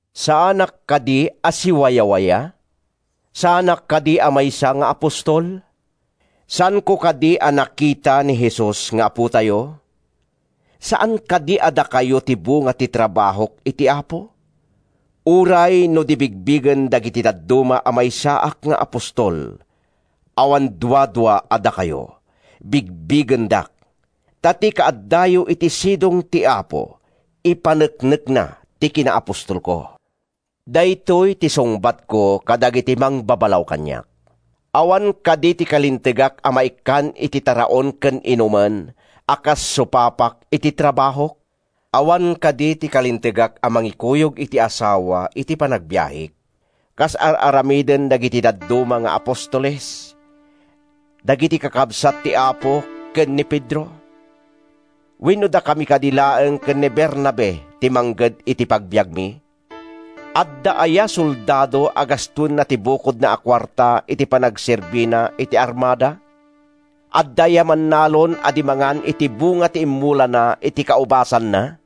Saanak kadi a siwayawaya? Saanak kadi a maysa nga apostol? Saanko kadi a nakita ni Jesus nga Apotayo? Saan kadi a dakayo ti bunga ti trabahok iti Apo? Uray no di bigbigen dagiti dadduma a maysaak nga apostol, awan duadua a dakayo, bigbigendak, ta ti kaaddayo iti sidong ti Apo ipaneknekna ti kinaapostolko. Daytoy ti sungbatko kadagiti mangbabalaw kaniak: Awan kadi ti kalintegak a maikkan iti taraon ken inumen a kas supapak iti trabahok? Awan kadi ti kalintegak a mangikuyog iti asawa iti panagbiahek, kas ar-aramiden dagiti dadduma nga apostoles, dagiti kakabsat ti Apo ken ni Pedro? Wenno dakami kadi laeng ken ni Bernabe ti mangged iti pagbiagmi? Adda aya soldado a gastoenna ti bukodna a kuarta iti panagserbina iti armada? Adda aya mannalon a di mangan iti bunga ti immulana iti kaubasanna?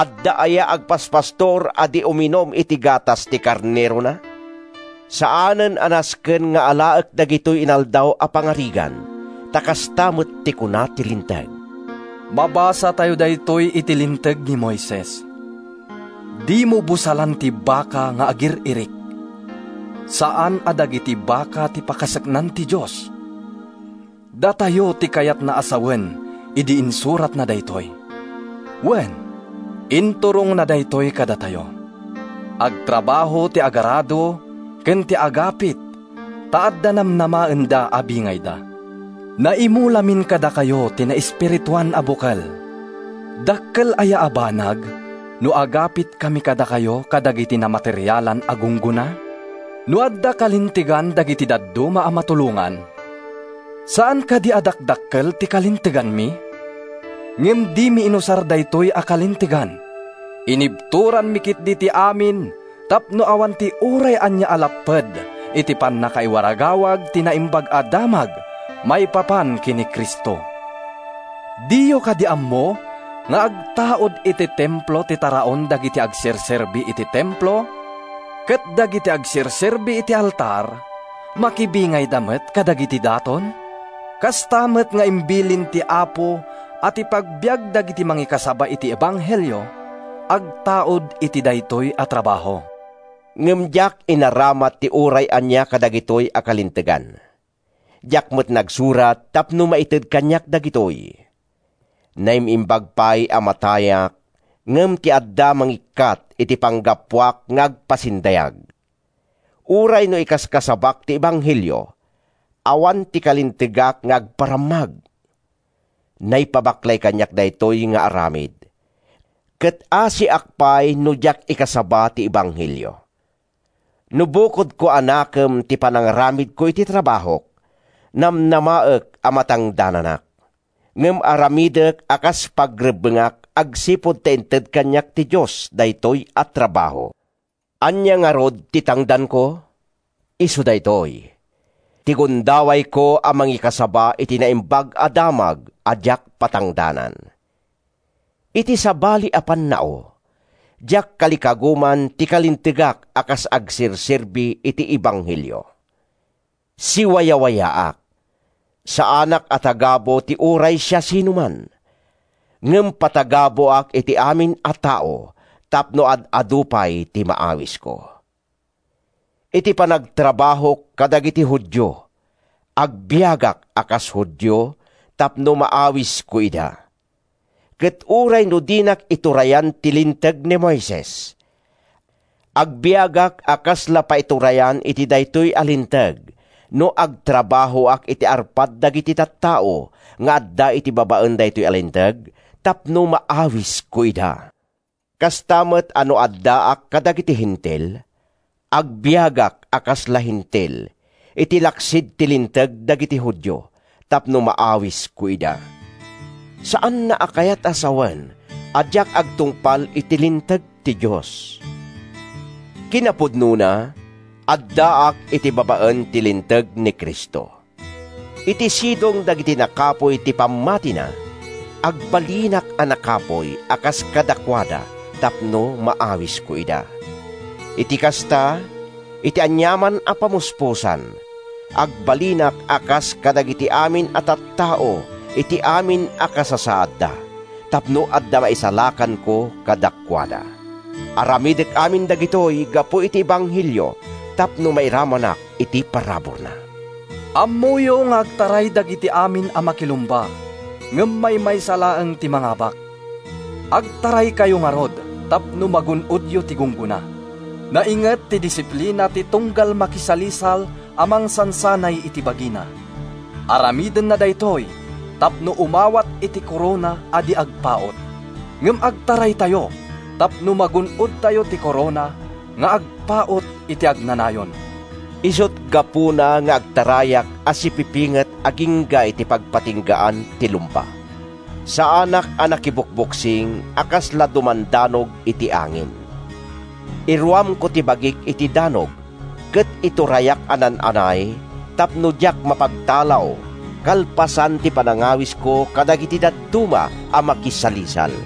Adda aya agpaspastor a di uminum iti gatas ti karnerona? Saanen a nasken nga alaek dagitoy inaldaw a pangarigan ta kasta met ti kuna ti Linteg. Mabasatayo daytoy iti Linteg ni Moises, “Dimo busalan ti baka nga agir-irik.” Saan a dagiti baka ti pakaseknan ti Dios. Datayo ti kayatna a sawen idi insuratna daytoy. Wen, inturongna daytoy kadatayo. Agtrabaho ti agarado ken ti agapit ta adda namnamaenda a bingayda. Naimulamin kadakayo ti naespirituan a bukel. Dakkel aya a banag no agapitkami kadakayo kadagiti namaterialan a gunggona? No adda kalintegan dagiti dadduma a matulongan, saan kadi a dakdakkel ti kalinteganmi? Ngem dimi inusar daytoy a kalintegan. Inibturanmi ketdi ti amin tapno awan ti uray ania a lapped iti pannakaiwaragawag ti Naimbag a Damag maipapan ken ni Cristo. Diyo kadi ammo nga agtaud iti Templo ti taraon dagiti agserserbi iti Templo ket dagiti agserserbi iti altar, makibingayda met kadagiti daton? Kasta met nga imbilin ti Apo a ti pagbiag dagiti mangikasaba iti ebanghelio agtaud iti daytoy a trabaho. Ngem diak inaramat ti uray ania kadagitoy a kalintegan. Diak met nagsurat tapno maited kaniak dagitoy. Naim-imbag pay a matayak ngem ti adda mangikkat iti panggapuak nga agpasindayag! Uray no ikaskasabak ti ebanghelio, awan ti kalintegak nga agparammag. Naipabaklay kaniak daytoy nga aramid, ket asiak pay no diak ikasaba ti ebanghelio! No bukodko a nakem ti panangaramidko iti trabahok, namnamaek a matangdananak. Ngem aramidek a kas pagrebbengak agsipud ta inted kaniak ti Dios daytoy a trabaho. Ania ngarud ti tangdanko? Isu daytoy: ti gundawayko a mangikasaba iti Naimbag a Damag a diak patangdanan. Iti sabali a pannao, diak kalikaguman ti kalintegak a kas agserserbi iti ebanghelio. Siwayawayaak. Saanak a tagabu ti uray siasinoman. Ngem patagabuak iti amin a tao tapno ad-adu pay ti maawisko. Iti panagtrabahok kadagiti Judio, agbiagak a kas Judio tapno maawisko ida. Ket uray no dinak iturayan ti Linteg ni Moises, agbiagak a kasla paiturayan iti daytoy a linteg no agtrabahoak iti arpad dagiti tattao nga adda iti babaen daytoy a linteg tapno maawisko ida. Kasta met a no addaak kadagiti Hentil, agbiagak a kasla Hentil, iti laksid ti Linteg dagiti Judio, tapno maawisko ida. Saanna a kayat a sawen a diak agtungpal iti linteg ti Dios. Kinapudnona, addaak iti babaen ti linteg ni Cristo. Iti sidong dagiti nakapuy ti pammatina, agbalinak a nakapuy a kas kadakuada tapno maawisko ida. Iti kasta, iti aniaman a pamuspusan, agbalinak a kas kadagiti amin a tattao iti amin a kasasaadda tapno adda maisalakanko kadakuada. Aramidek amin dagitoy gapu iti ebanghelio tapno mairamanak iti paraburna. Ammoyo nga agtaray dagiti amin a makilumba ngem maymaysa laeng ti mangabak. Agtaraykayo ngarud tapno magun-odyo ti gunggona. Nainget ti disiplina ti tunggal makisalisal a mangsansanay iti bagina. Aramidenna daytoy tapno umawat iti korona a di agpaut. Ngem agtaraytayo tapno magun-odtayo ti korona nga agpaut iti agnanayon. Isut’ gapuna nga agtarayak a sipipinget agingga iti pagpatinggaan ti lumba. Saanak a nakibokboksing a kasla dumandanog iti angin. Iruamko ti bagik iti danog ket iturayak a naan-anay tapno diak mapagtalaw kalpasan ti panangawisko kadagiti dadduma a makisalisal.